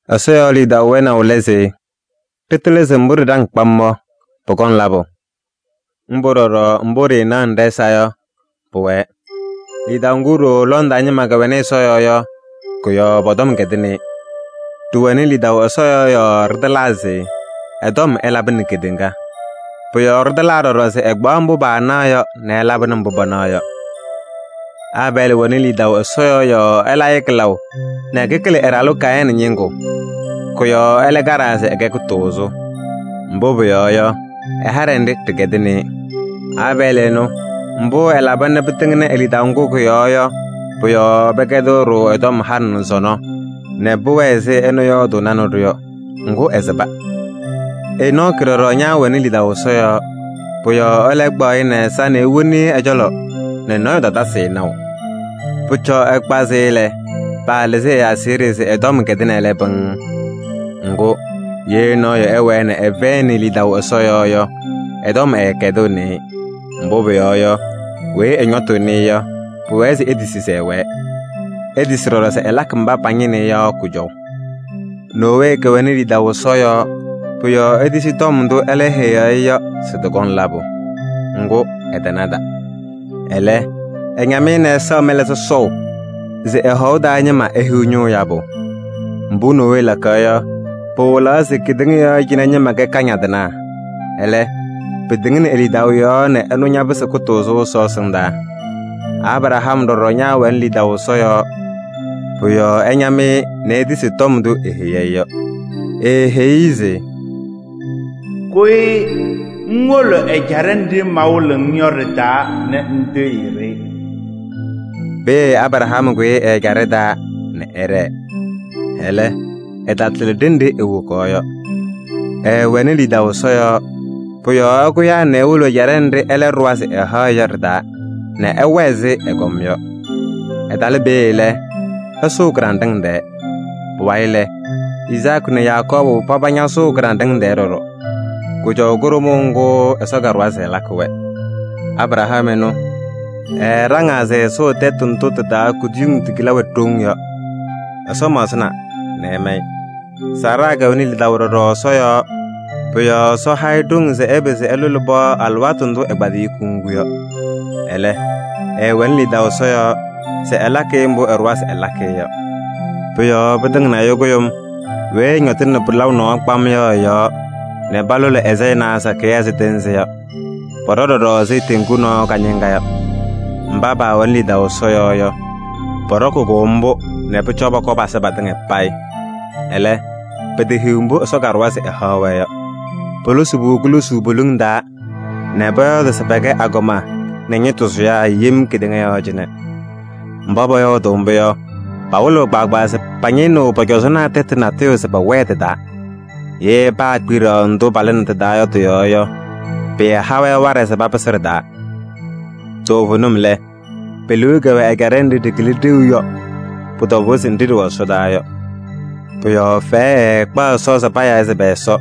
Ɛsɔ yɔɔ lidaʋ wɛnaʋ lɛ se ɖɩtɩlɩ se mbʋ ɖɩɖaŋ kpam yɔ, pʋkɔŋ labʋ. Mbʋ ɖɔɖɔ mbʋ ɖɩɩnaɣnɩ ɖɛ-ɛza yɔ, pʋwɛɛ. Lidaʋ ŋgʋ ɖooo lɔŋ taa ñɩma kɛwɛnɩ Ɛsɔ yɔɔ yɔ, kʋ-yɔɔ pɔ-tɔm kɛdɩnɩ-ɩ. Ɖɩwɛnɩ lidaʋ Ɛsɔ yɔɔ yɔɔ ɖɩtɩlaa se ɛ-tɔm ɛlabɩnɩ kedeŋa. Pʋ-yɔɔ ɖɩtɩlaa ɖɔɖɔ se ɛkpaɣ mbʋ paanaɣ yɔ nɛ ɛlabɩnɩ mbʋ panaɣ yɔ. Aabɛɛlɩ wɛnɩ lidaʋ Ɛsɔ yɔɔ yɔɔ ɛla-ɩ kɩlaʋ nɛ kɩkɩlɩ ɛ-ɖalʋ Kayɩnɩ ñɩŋgʋ. Kʋ-yɔɔ ɛlɛ kaɖaa se ɛkɛ kʋtʋʋzʋ. Mbʋ pʋyɔɔ yɔ, ɛ-haɖɛ nɖɩ ɖɩkɛdɩnɩ-ɩ. Aabɛɛlɩ ɛnʋ, mbʋ ɛlaba nɛ pɩtɩŋnɩ e-lidaʋ ŋgʋ kʋ-yɔɔ yɔ, pʋ-yɔɔ pɛkɛdɩɣ-ɖʋ ɛ-tɔm halɩ nɛ sɔnɔ nɛ pʋwɛɛ ɛzɩ ɛnʋ yɔɔdʋʋnɩnɩ-ɖʋ yɔ. Ŋgʋ ɛsɩba. Enɔɔkɩ ɖɔɖɔ ñaawɛnɩ lidaʋ Ɛsɔ yɔɔ. Pʋ-yɔɔ ɛlɛ kpaɣ-ɩ nɛ ɛ-ɛza nɛ ewoni-i ɛ-cɔlɔ nɛ nɔɔyʋ tatasɩ-ɩ naʋ. Pʋcɔ ɛkpazɩ-ɩ lɛ, paalɩzɩ ɛ-aseɣɖe se ɛ-tɔm kɛdɩnɩ ɛlɛ pɩŋŋ. Ŋgʋ, ye nɔɔyʋ ɛwɛɛ nɛ ɛfɛyɩnɩ lidaʋ Ɛsɔ yɔɔ yɔ, ɛ-tɔm ɛɛkɛdɩɣnɩ-ɩ. Mbʋ pʋyɔɔ yɔ, weyi ɛñɔtʋʋnɩ-ɩ yɔ, pʋwɛɛ se etisi se ɛwɛɛ. Etisi ɖɔɖɔ se ɛlakɩ mba pañɩnɩɣ-ɩ yɔ kʋjɔʋ. Nowee kɛwɛnɩ lidaʋ Ɛsɔ yɔɔ, pʋ-yɔɔ etisi tɔm ndʋ ɛlɛ heyaɣ-i yɔ se tɩkɔŋ labʋ. Ŋgʋ, ɛtanada. Ɛlɛ, ɛñam-ɩ nɛ ɛsaɣ mɛlɛ sɔsɔʋ se ɛ-hɔʋ taa ñɩma ehiɣ ñʋʋ yabʋ. Mbʋ Nowee lakaɣ yɔ, pɩwɩlaɣ se kedeŋa yɔɔ cɩnɛ ñɩma kɛ kañadɩnaa. Ɛlɛ, pɩtɩŋnɩ e-lidaʋ yɔɔ nɛ ɛnʋ ñapɩsɩ kʋtʋʋzʋ Ɛsɔ ɛsɩndaa. Abraham ɖɔɖɔ ñaawɛnɩ lidaʋ Ɛsɔ yɔɔ, pʋ-yɔɔ ɛñam-ɩ nɛ etisi tɔm ndʋ eheyi-i yɔ. Eeheyi-i se: “Kʋyɩ ŋwolo ɛjaɖɛ nɖɩ mawɩlɩɣ-ŋ yɔ ɖɩ-taa nɛ ŋtɩɣyɩ-ɖɩ.” Peeye Abraham kʋyɩ ɛ-ɛjaɖɛ taa nɛ ɛɖɛɛ. Ɛlɛ, ɛtatɩlɩ ɖenɖe ewokaɣ yɔ. Ɛɛwɛnɩ lidaʋ Ɛsɔ yɔɔ, pʋ-yɔɔ ɛkʋyaa nɛ ewolo ɛjaɖɛ nɖɩ ɛlɛ ɖʋwa se ɛhaɣ-ɩ yɔ ɖɩ-taa nɛ ɛwɛɛ ɛzɩ ɛgɔm yɔ. Ɛtalɩ peeye lɛ, ɛsʋʋ kɩɖanɖɩŋ tɛɛ. Pʋwayɩ lɛ, Izaakɩ nɛ Yakɔɔbʋ paba ñasʋʋ kɩɖanɖɩŋ tɛɛ ɖɔɖɔ: kʋjɔʋ kʋɖʋmʋʋ ŋgʋ Ɛsɔ kaɖʋwa se ɛlakɩ-wɛ. Abraham ɛnʋ, ɛɛɖaŋaa se ɛsʋʋ tɛtʋ ndʋ tɩ-taa kuduyiŋ tigila wɛ ɖoŋ yɔ. Ɛsɔ maɣzɩna nɛ ɛma-ɩ. Saara kɛwɛnɩ lidaʋ ɖɔɖɔ Ɛsɔ yɔɔ, pʋ-yɔɔ Ɛsɔ ha-ɩ ɖoŋ se ɛpɩzɩ ɛlʋlɩ pɩɣa alɩwaatʋ ndʋ ɛkpadayɩ kuŋgu yɔ. Ɛlɛ, ɛɛwɛnɩ lidaʋ Ɛsɔ yɔɔ se ɛlakɩ mbʋ ɛɖʋwa se ɛlakɩ-ɩ yɔ. Pʋ-yɔɔ pɩtɩŋnɩ ɛyʋ kʋɖʋm weyi ɛñɔtɩnɩ pɩlaʋ nɔɔ kpam yɔ ɛ-yɔɔ nɛ palʋlɩ ɛ-sayɩnaa sakɩyɛ ɛzɩ tɩɩnzɩ yɔ. Pɔɖɔ ɖɔɖɔ ɛzɩ teŋgu nɔɔ kañɩŋa yɔ. Mba paawɛnɩ lidaʋ Ɛsɔ yɔɔ yɔ, pɔɖɔkɩ-kʋ mbʋ nɛ pʋcɔ pɔkɔɔ pasɩ patɩŋa payɩ. Ɛlɛ, petehiɣ mbʋ Ɛsɔ kaɖʋwa se ɛhaɣ-wɛ yɔ. Polosi-pʋ kulosuu poliŋ taa nɛ pɔyɔɔdɩ se pɛkɛ agɔma nɛ ñɩtʋ sʋyaa yem kedeŋa yɔɔ cɩnɛ. Mba pɔyɔɔdʋʋ mbʋ yɔ, pawɩlɩɣ kpaagbaa se pañɩnɩɣ pɔ-cɔzɔnaa tɛtʋ natʋyʋ se pɛwɛɛ tɩ-taa. Ye paakpiɖaɣ ndʋ palɩnɩ tɩ-taa yɔ tɩ-yɔɔ yɔ, pɩɩha-wɛ waɖɛ se papɩsɩ ɖɩ-taa. Toovenim lɛ, pe-liu kɛwɛ ɛjaɖɛ nɖɩ ɖɩkɩlɩ ɖeu yɔ. Pʋ-tɔbʋʋ se nɖɩ ɖɩwɛ ɛsɔdaa yɔ. Pʋ-yɔɔ fɛyɛ ɛɛkpaɣ Ɛsɔ se payaa-ɩ se pɛ-Ɛsɔ.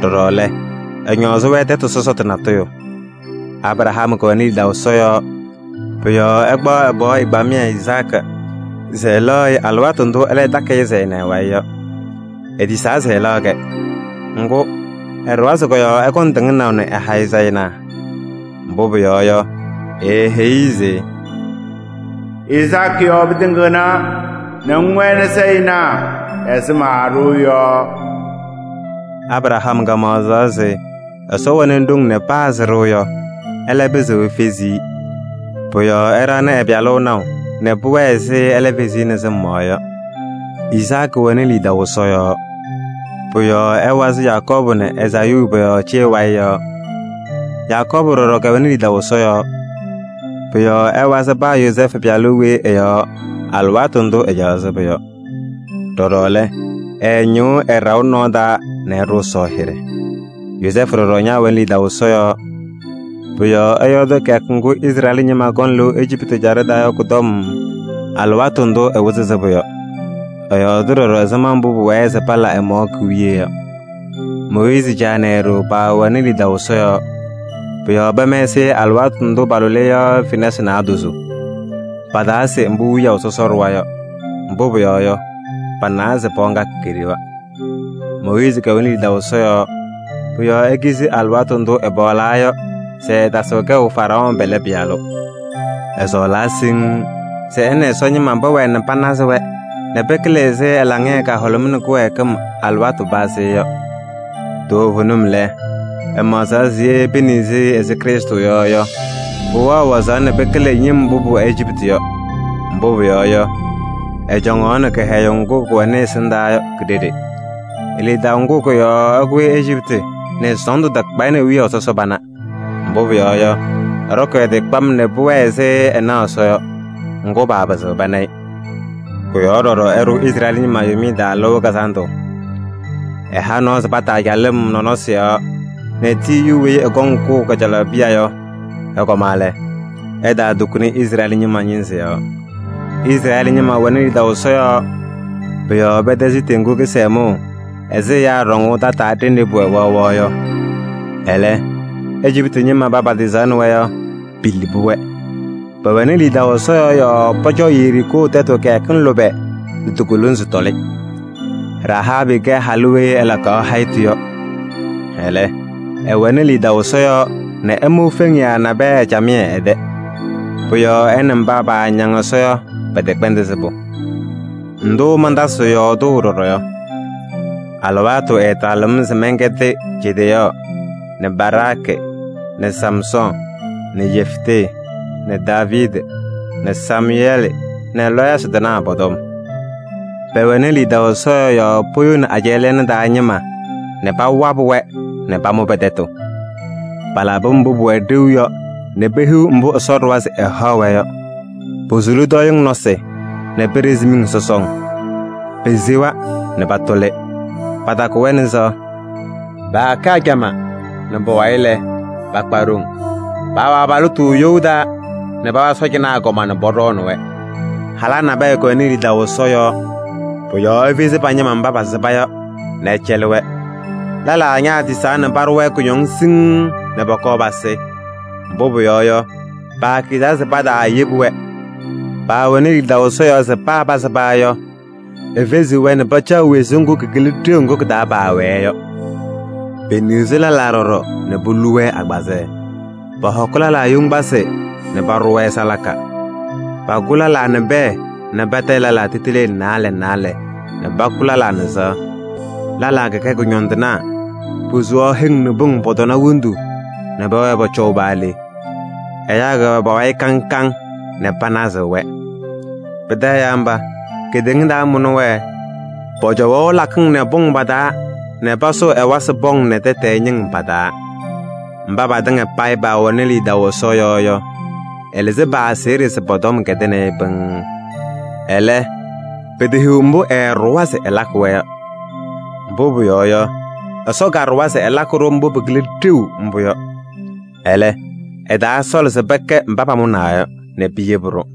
Ɖɔɖɔ lɛ, ɛñɔɔzɩ-wɛ tɛtʋ sɔsɔtʋ natʋyʋ. Abraham kɛwɛnɩ lidaʋ Ɛsɔ yɔɔ, pʋ-yɔɔ ɛkpaɣ ɛ-pɩɣa ɛgbamɩyɛ Izaakɩ se ɛlaɣ-ɩ alɩwaatʋ ndʋ ɛlɛ takɩ-ɩ se ɛna ɛ-wayɩ yɔ. Etisaa se ɛlaɣ-kɛ. Ŋgʋ, ɛɖʋwa se kɔ-yɔɔ ɛkɔŋ tɩŋnaʋ nɛ ɛha-ɩ sayɩnaa. Mbʋ pʋyɔɔ yɔ, eeheyi-i se: “Izaakɩ yɔɔ pɩtɩŋɩɣna nɛ ŋwɛnɩ sayɩnaa ɛzɩ maaɖʋʋ yɔ.” Abraham maɣzaɣ se Ɛsɔ wɛnɩ ɖoŋ nɛ paa sɩɖʋ yɔ, ɛlɛ pɩzɩɣ efezi-i. Pʋ-yɔɔ ɛɖaɣnɩ ɛ-pɩyalʋ naʋ nɛ pʋwɛɛ ɛzɩ ɛlɛ fezi-i nɛ sɩm yɔɔ yɔ. Izaakɩ wɛnɩ lidaʋ Ɛsɔ yɔɔ, pʋ-yɔɔ ɛwazɩ Yakɔɔbʋ nɛ Ezaayuu pɔ-yɔɔ cee wayɩ yɔɔ. Yakɔɔbʋ ɖɔɖɔ kɛwɛnɩ lidaʋ Ɛsɔ yɔɔ, pʋ-yɔɔ ɛwazɩ paa Yozɛɛfʋ pɩyalʋ weyi ɛ-yɔɔ alɩwaatʋ ndʋ ɛcaɣaɣ sɩbʋ yɔ. Ɖɔɖɔ lɛ, ɛɛñɩɣ ɛ-ɖaʋ nɔɔ taa nɛ ɛɖʋ Ɛsɔ hɩɖɛ. Yozɛɛfʋ ɖɔɖɔ ñaawɛnɩ lidaʋ Ɛsɔ yɔɔ. Pʋ-yɔɔ ɛyɔɔdɩ kɩyakʋ ŋgʋ Izrɛɛlɩ ñɩma kɔŋ lɩʋ Ejiptɩ ɛjaɖɛ taa yɔ kʋ-tɔm alɩwaatʋ ndʋ ɛwɩzɩ sɩbʋ yɔ. Ɛyɔɔɖɩ ɖɔɖɔ ɛzɩma mbʋ pʋwɛɛ se pala ɛ-mɔɔ ki-wiye yɔ. Mooyiizi caa nɛ e-ɖoo paawɛnɩ lidaʋ Ɛsɔ yɔɔ. Pʋ-yɔɔ pɛmɛsɩ-ɩ alɩwaatʋ ndʋ palʋlɩ-ɩ yɔ fenasɩ naadozo. Pataase mbʋ wiyaʋ sɔsɔ ɖʋwa yɔ, mbʋ pʋyɔɔ yɔ, panawa se pɩɣa ŋga keɖewa. Mooyiizi kɛwɛnɩ lidaʋ Ɛsɔ yɔɔ, pʋ-yɔɔ ekizi alɩwaatʋ ndʋ ɛpaɣlaa yɔ se ɛɛtasɩɣ kɛʋ Faraɔɔ pɛlɛ pɩyalʋ. Ɛsɔɔlaa siŋŋ se ɛ nɛ Ɛsɔ ñɩma pɛwɛɛ nɛ panazɩ-wɛ nɛ pɩkɩlɩ ɛzɩ ɛ-laŋɩyɛ kahʋlʋmɩnɩ kɩwɛɛkɩm alɩwaatʋ pazɩ yɔ. Toovenim lɛ, ɛmaɣzaɣ se ye peniɣzi-i ɛzɩ Krɩstʋ yɔ yɔ, pʋwɛɣ wazaɣ nɛ pɩkɩlɩ ñɩm mbʋ pʋwɛ Ejiptɩ yɔ. Mbʋ pʋyɔɔ yɔ, ɛcɔŋaɣnɩ kɩhɛyʋʋ ŋgʋ kʋwɛnɩ ɛsɩndaa yɔ ki-ɖeɖe. E-lidaʋ ŋgʋ kʋ-yɔɔ ɛkʋyɩ Ejiptɩ nɛ sɔɔndʋ takpa-ɩ nɛ wiyaʋ sɔsɔ pana. Mbʋ pʋyɔɔ yɔ, ɛɖɔkɩ ɛ-tɩ kpam nɛ pʋwɛɛ ɛzɩ ɛnaɣ Ɛsɔ yɔ, ŋgʋ, paapɩzɩɣ pana-ɩ. Kʋ-yɔɔ ɖɔɖɔ ɛɖʋ Izrɛɛlɩ ñɩma Yomiye Taa Lɩʋ Kazandʋ. Ɛha nɔɔ se pataa calɩm nɔnɔsɩ yɔɔ nɛ tiyiyu weyi ɛkɔŋ kʋʋ kajalaɣ piya yɔ, ɛkɔma lɛ, ɛtaatukuni Izrɛɛlɩ ñɩma ñɩnzɩ yɔɔ. Izrɛɛlɩ ñɩma wɛnɩ lidaʋ Ɛsɔ yɔɔ, pʋ-yɔɔ pɛtɛzɩ Teŋgu Kɩsɛmʋʋ ɛzɩ ɛyaa ɖɔŋʋʋ tataa ɖenɖe pʋwɛ waɣwaɣ yɔ. Ɛlɛ, Ejiptɩ ñɩma mba patɩɣzaɣnɩ-wɛ yɔ, pilibi-wɛ. Pɛwɛnɩ lidaʋ Ɛsɔ yɔɔ yɔɔ pɔcɔ Yeriikoo tɛtʋ kɩyakɩŋ lʋbɛ nɛ ti-kolonzi tɔlɩ. Rahaabɩ kɛ halʋ weyi ɛpɛdaɣ ɛ-tɩ yɔ. Ɛlɛ, ɛwɛnɩ lidaʋ Ɛsɔ yɔɔ nɛ ɛmʋ feŋiyaa nabɛyɛ camɩyɛ ɛ-tɛ. Pʋ-yɔɔ ɛ nɛ mba paañaŋ Ɛsɔ yɔ pɛtɛkpɛndɩ sɩbʋ. Ndʋ mantasɩɣ yɔɔdʋʋ ɖɔɖɔ yɔ? Alɩwaatʋ ɛɛtalɩɣ-m se mɛnkɛdɩ Jedeyɔɔ nɛ Baraakɩ nɛ Samsɔɔ nɛ Yeftee nɛ Daaviidi nɛ Samʋyɛɛlɩ nɛ lɔɔyɩsɩ tɩnaa pɔ-tɔm. Pɛwɛnɩ lidaʋ Ɛsɔ yɔɔ yɔɔ poyoni ajɛɛ lɛɛna taa ñɩma nɛ pawabɩ-wɛ nɛ pamʋ pɛ-tɛtʋ. Palabɩ mbʋ pʋwɛ ɖeu yɔ nɛ pehiɣ mbʋ Ɛsɔ ɖʋwa se ɛhaɣ-wɛ yɔ. Posuli tɔɔyɩŋ nɔsɩ nɛ peɖezi miŋ sɔsɔŋ. Pesewa nɛ patʋlɩ, patakʋ-wɛ nɛ sɩɣa. Paakɛ ajamaa nɛ pʋwayɩ lɛ, pakpa ɖoŋ. Paawɛ abalɩtʋ you taa nɛ pawa sɔɔjanaa agɔma nɛ pɔɖɔɔnɩ-wɛ. Halaa nabɛyɛ kɛwɛnɩ lidaʋ Ɛsɔ yɔɔ, pʋ-yɔɔ efezi pa-ñɩma mba pasɩba yɔ nɛ ɛcɛlɩ-wɛ. Lɛlaa ñaatisaa nɛ paɖʋ-wɛ kʋñɔŋ siŋŋ nɛ pɔkɔɔ pasɩ, mbʋ pʋyɔɔ yɔ, paakizaa se pataayebi-wɛ. Paawɛnɩ lidaʋ Ɛsɔ yɔɔ se paa pasɩba yɔ, efeziɣ-wɛ nɛ pacaɣ wezuu ŋgʋ kɩkɩlɩ ɖeu ŋgʋ kɩ-taa paawɛɛ yɔ. Peniɣzi lɛlaa ɖɔɖɔ nɛ polu-wɛ agbazɛɛ. Pɔhɔkɩ lɛlaa yoŋgbasɩ nɛ paɖʋ-wɛ salaka. Pakʋ lɛlaa nɛ pɛɛ nɛ patayɩ lɛlaa titilee naalɛ naalɛ nɛ pakʋ lɛlaa nɛ sɩɣa. Lɛlaa kɛkɛ kʋñɔndɩnaa, posuu heŋ nɛ pʋŋ pɔ-tɔna wondu nɛ pɛwɛɛ pɔcɔʋ paa le. Ɛyaa kɛwɛ pa-wayɩ kaŋ kaŋ nɛ panazɩɣ-wɛ. Pɩtɛ ɛyaa mba, kedeŋa taamʋnɩ-wɛ! Pɔcɔwaɣ lakɩŋ nɛ pʋŋ pa-taa nɛ pasʋʋ ɛwasɩ pɔŋ nɛ tɛtɛɛ ñɩŋ pa-taa. Mba patɩŋa payɩ paawɛnɩ lidaʋ Ɛsɔ yɔɔ yɔ, ɛlɩzɩ pa-aseɣɖe se pɔ-tɔm kɛdɩnɩ-ɩ pɩŋŋ. Ɛlɛ, petehiɣ mbʋ ɛɛɖʋwa se ɛlakɩ-wɛ yɔ. Mbʋ pʋyɔɔ yɔ, Ɛsɔ kaɖʋwa se ɛlakɩ-ɖʋ mbʋ pɩkɩlɩ ɖeu mbʋ yɔ. Ɛlɛ, ɛtaasɔɔlɩ se pɛkɛ mba pamʋnaa yɔ nɛ piyebi-ɖʋ.